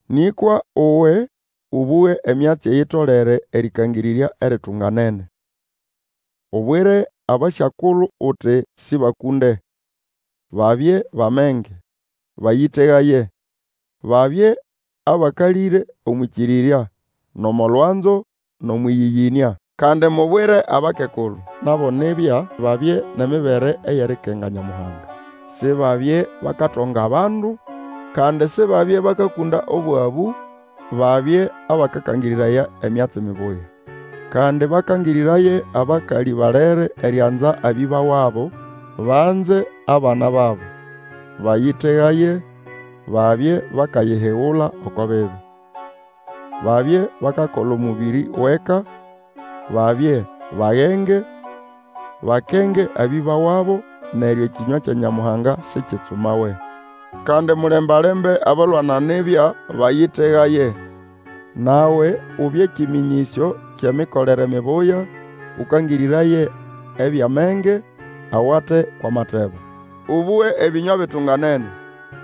Nĩkwa uwe, ũbũge emyatsi eyitolere erĩkangĩrĩrya eritunganene. Ubwire abasyakulu uti sĩbakũnde, babye bʼamenge, bayĩtegaye; babye abakalĩre omwʼĩkĩrĩrya, nʼomo lwanzo, nʼomwʼĩyĩyĩnĩa. Kandi mubwire abakekulu, nabo nibya babye nʼemibere eyikakenga Nyamuhanga, Sibabye bakatonga abandu, kandi Sibabye bakakũnda obwabũ, babye Ĩbakakangĩrĩraya emyatsi mibuya. Kandi bakangĩrĩraye abakalĩ balere erianza abĩba wabo, banze abana babo, bayĩtegaye, babye bakayihigula oko bibi. Babye bakakola omũbĩrĩ wʼeka, babye bagenge, bakenge abĩba wabo, neryo ekĩnywa kya Nyamuhanga sikitsumawe. Kandi mulemba-lembe abalwana nibya, bayĩtegaye. Nawe ubye kĩmĩnyĩsyo kyʼemikolere mibuya, ũkangĩrĩraye ebyʼamenge, awate ko matebo. Ũbũge ebĩnywa bitunganene,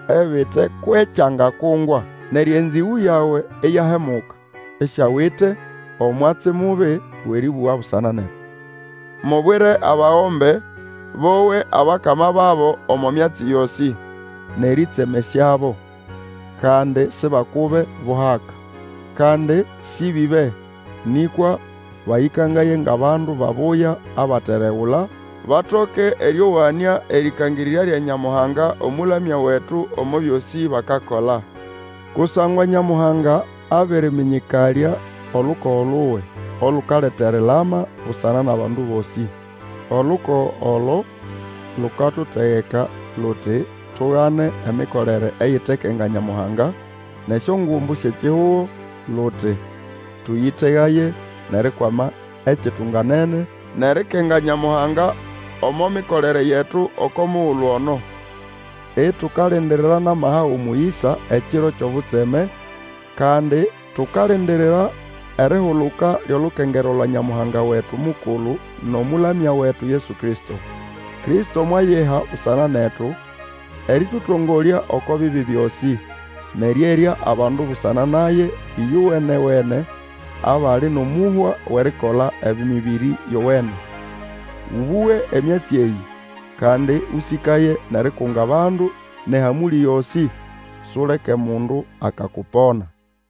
ebite kwʼekyangakungwa. Neryo enzĩgũ yawe iyahemuka, isiawite omwatsi mubi wʼerĩbũga busana netu. Mubwire abagombe, bowe abakama babo omo myatsi yosĩ, nʼerĩtsemesyabo, kandi sibakube buhaka. Kandi sĩbĩbe, nĩkwa bayĩkangaye ngʼabandu babuya abateregula, batoke erĩowanĩa erĩkangĩrĩrya lya Nyamuhanga Omũlamya wetu omo byosĩ bakakola. Kusangwa Nyamuhanga abĩrĩmĩnyĩkalya olukogo luwe, olukaleta erilama, busana nʼabandu bosĩ. Olukogo olo lukatutegeka luti, tugane emikolere eyitekenga Nyamuhanga, nʼesyongumbu syʼekihugo, luti, tũyĩtegaye, nʼerikwama ekitunganene, nʼerikenga Nyamuhanga omo mikolere yetu oko mugulu ono, itukalindirira nʼamaha gʼomũyĩsa ekiro kyʼobutseme, kandi tukalindirira erihuluka lyʼolukengerwa lwa Nyamuhanga wetu mukulu, nʼomũlamya wetu, Yesu Kristo. Kristo mwayiha busana netu erĩtũtongolya oko bibi byosĩ, nʼerĩerya abandu busana naye ĩyowene-wene, abali nʼomũhwa wʼerikola emĩbĩrĩ yowene. Ũbũge emyatsi eyĩ, kandi Ũsĩkaye nʼerikunga abandu nʼehamũlĩ yosĩ. Suleke mundu akakupona.